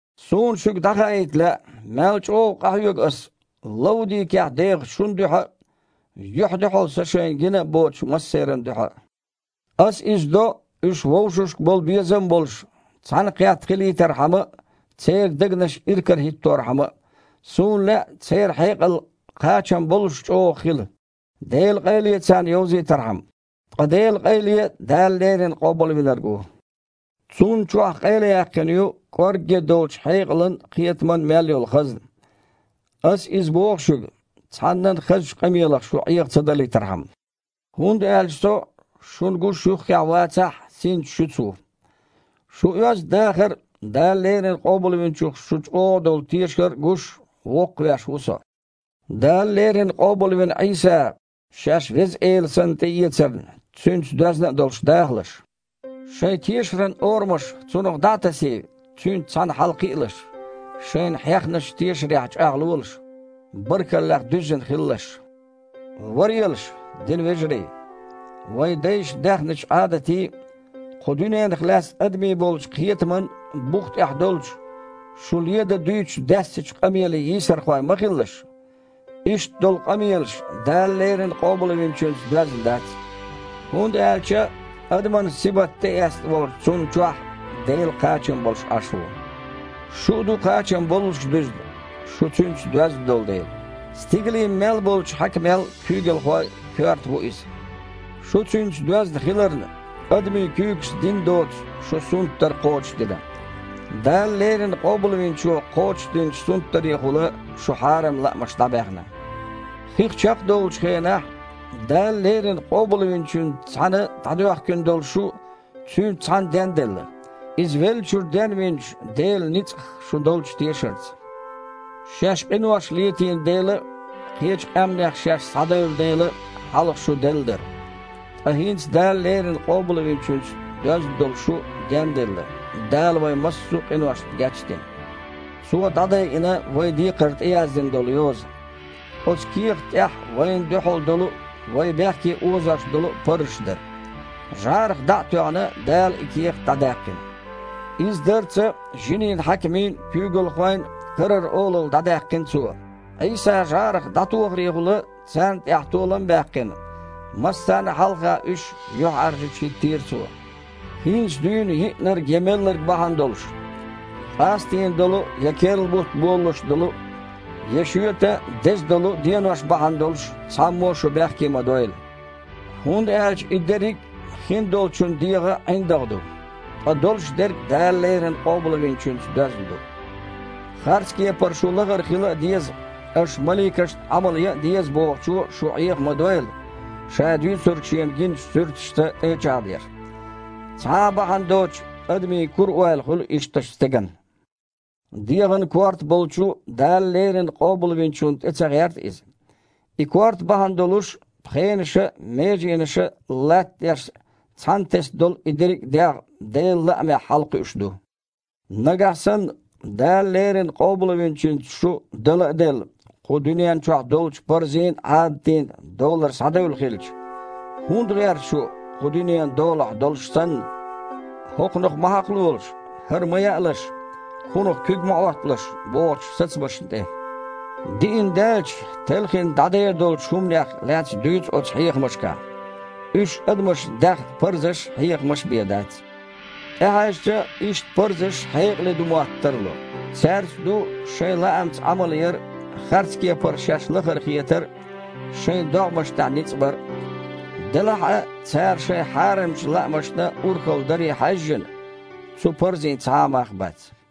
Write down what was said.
Суна шуьга дІахаийта лаьа, мел чІогІа къахьоьгу аса Лаудикехь дехачу шун дуьхьа а, юьхь-дуьхьал со шайна гина а боцучу массеран дуьхьа а. Аса иза до, уьш, вовшашка болу безам а болуш, цхьаьнакхетта хилийтархьама а, церан дегнаш иракарахІитторхьама а. Суна лаьа, церан хьекъал кхачам боллуш чІогІа хила, Делан къайле царна йовзийтархьама. Ткъа Делан къайле Дала леррина Къобалвинарг ву. Цунна чохь къайлаяьккхина ю кІоргге долчу хьекъалан а, кхетаман а мел йолу хазна. Аса иза боху шуьга, цхьаннан а хазачу къамелах шу Іеха ца далийтархьама. ХІунда аьлча со, шуна гуш юххехь вацахь а, синца шуьца ву. Шун оьзда дахар а, Дала леррина Къобалвинчух шун чІогІа долу тешар а гуш, воккхавеш ву со. Дала леррина къобалвина Іийса шаьш Веза Эла санна тІеэцарна, Цуьнца доьзна а долуш, дахалаш. Шайн тешаран орамаш Цунах дІа а тасий, Цуьнца цхьаьна хьалакхиалаш. Шайна хьехначу тешарехь чІагІлолаш. Баркаллех дуьззина хилалаш. Варелаш, динан вежарий, вайн дайша даьхначу Іадатийн а, кху дуьненах лаьцна адамийн болчу кхетаман а бух тІехь долчу, шу ледан дуьйцучу даьссачу къамелийн йийсархой ма хилалаш. Иштта долу къамелаш Дала леррина Къобалвинчуьнца доьзна дац. ХІунда аьлча адаман сибат тІеэцна волчу Цунна чохь Дела кхачам болуш Іаш ву. Шу а ду кхачам боллуш дуьзна, шу Цуьнца доьзна долу дела. Стигалийн мел болчу хьаькамел а, куьйгалхойл а коьрта ву Иза. Шу Цуьнца доьзна хиларна, адамийн куьйгашца дина доцу шун сунтдар кхочушдина. Дала леррина Къобалвинчо кхочушдинчу сунтдарехула шун хьарам лаамаш дІабаьхна. Хих чекхдовлучу хенахь Дала леррина Къобалвинчуьнца цхьаьна дІадоьхкина долу шу Цуьнца цхьаьна денделла, Иза веллачуьра денвинчу Делан ницкъах шун долчу тешарца. Шаьш къинош летийна дела а, кхечу къаьмнех шаьш схьадевлла дела а, хьалха шу делла дара. Ткъа хІинца Дала леррина Къобалвинчуьнца доьзна долу шу денделла, Дала вайн массо а къиношна геч а дина. Цо дІадайина вайн декхар тІеяздина долу йоза. Оцу кехат тІехь вайна дуьхьал долу а, вай бехке озош долу а парзаш дара. ЖІарах дІа а тоьхна, Дала и кехат дІадаьккхина. Иза дарца жинийн хьаькамийн а, куьйгалхойн а карара олалла дІадаьккхина Цо. Іийса жІарах дІатохарехула царна тІехь толам а баьккхина, массарна а хьалха уьш юьхьІаьржачу хІиттийра Цо. ХІинца дуьйна йиънарг я мелларг бахьана долуш, къастийна долу а, я керла бутт болалуш долу а, я шоьтан деза долу а денош бахьана долуш цхьаммо а шу бехке ма дойла. ХІунда аьлча и дерриг а хиндолчун дегІан ІиндагІ ду, ткъа долуш дерг Дала леррина Къобалвинчуьнца доьзна ду. Харц кепара шу лахара хила а деза, аша маликашна Іамал ян а деза бохучо шу Іеха ма дойла, ша дуьйцург шена гиначу суьрташца тІе а чІагІдеш. Цхьа а бахьана доцуш, адамийн кура ойла хуьлу ишттачу стеган. ДегІан Корта болчу Дала леррина Къобалвинчунна тІе ца гІерта иза. И корта бахьана долуш, пхенаша а, меженаша а латтадеш цхьаьнатесна долу и дерриг а дегІ Делан лаамехь хьалакхуьуш ду. Нагахь санна Дала леррина Къобалвинчуьнца шу, дала а делла, кху дуьнен чохь долчу парзийн а, Іадатийн а долара схьадевлла хилча, хІунда гІерта шу, кху дуьненан долахь долуш санна, «хІокхунах ма хьакхалолаш», «хІара ма яалаш», «кхунах куьг ма Іотталаш» бохучу сацамашна тІе? Диина даьлча, телхина дІадер долчу хІуманех лаьцна дуьйцу оцу хьехамашкахь. Уьш адамаша даьхна парзаш а, хьехамаш а бен дац. ТІехьаьжча, иштта парзаш хьекъале ду мотта тарло: цаьрца ду шайн лаамца Іамал яр а, харцкепара шаьш лахара хетар а, шайн догІмашна тІехь ницкъ бар а. Делахь а, цара шайн хьарамчу лаамашна урхалла даре хьаьжжина, цу парзийн цхьа а мах бац.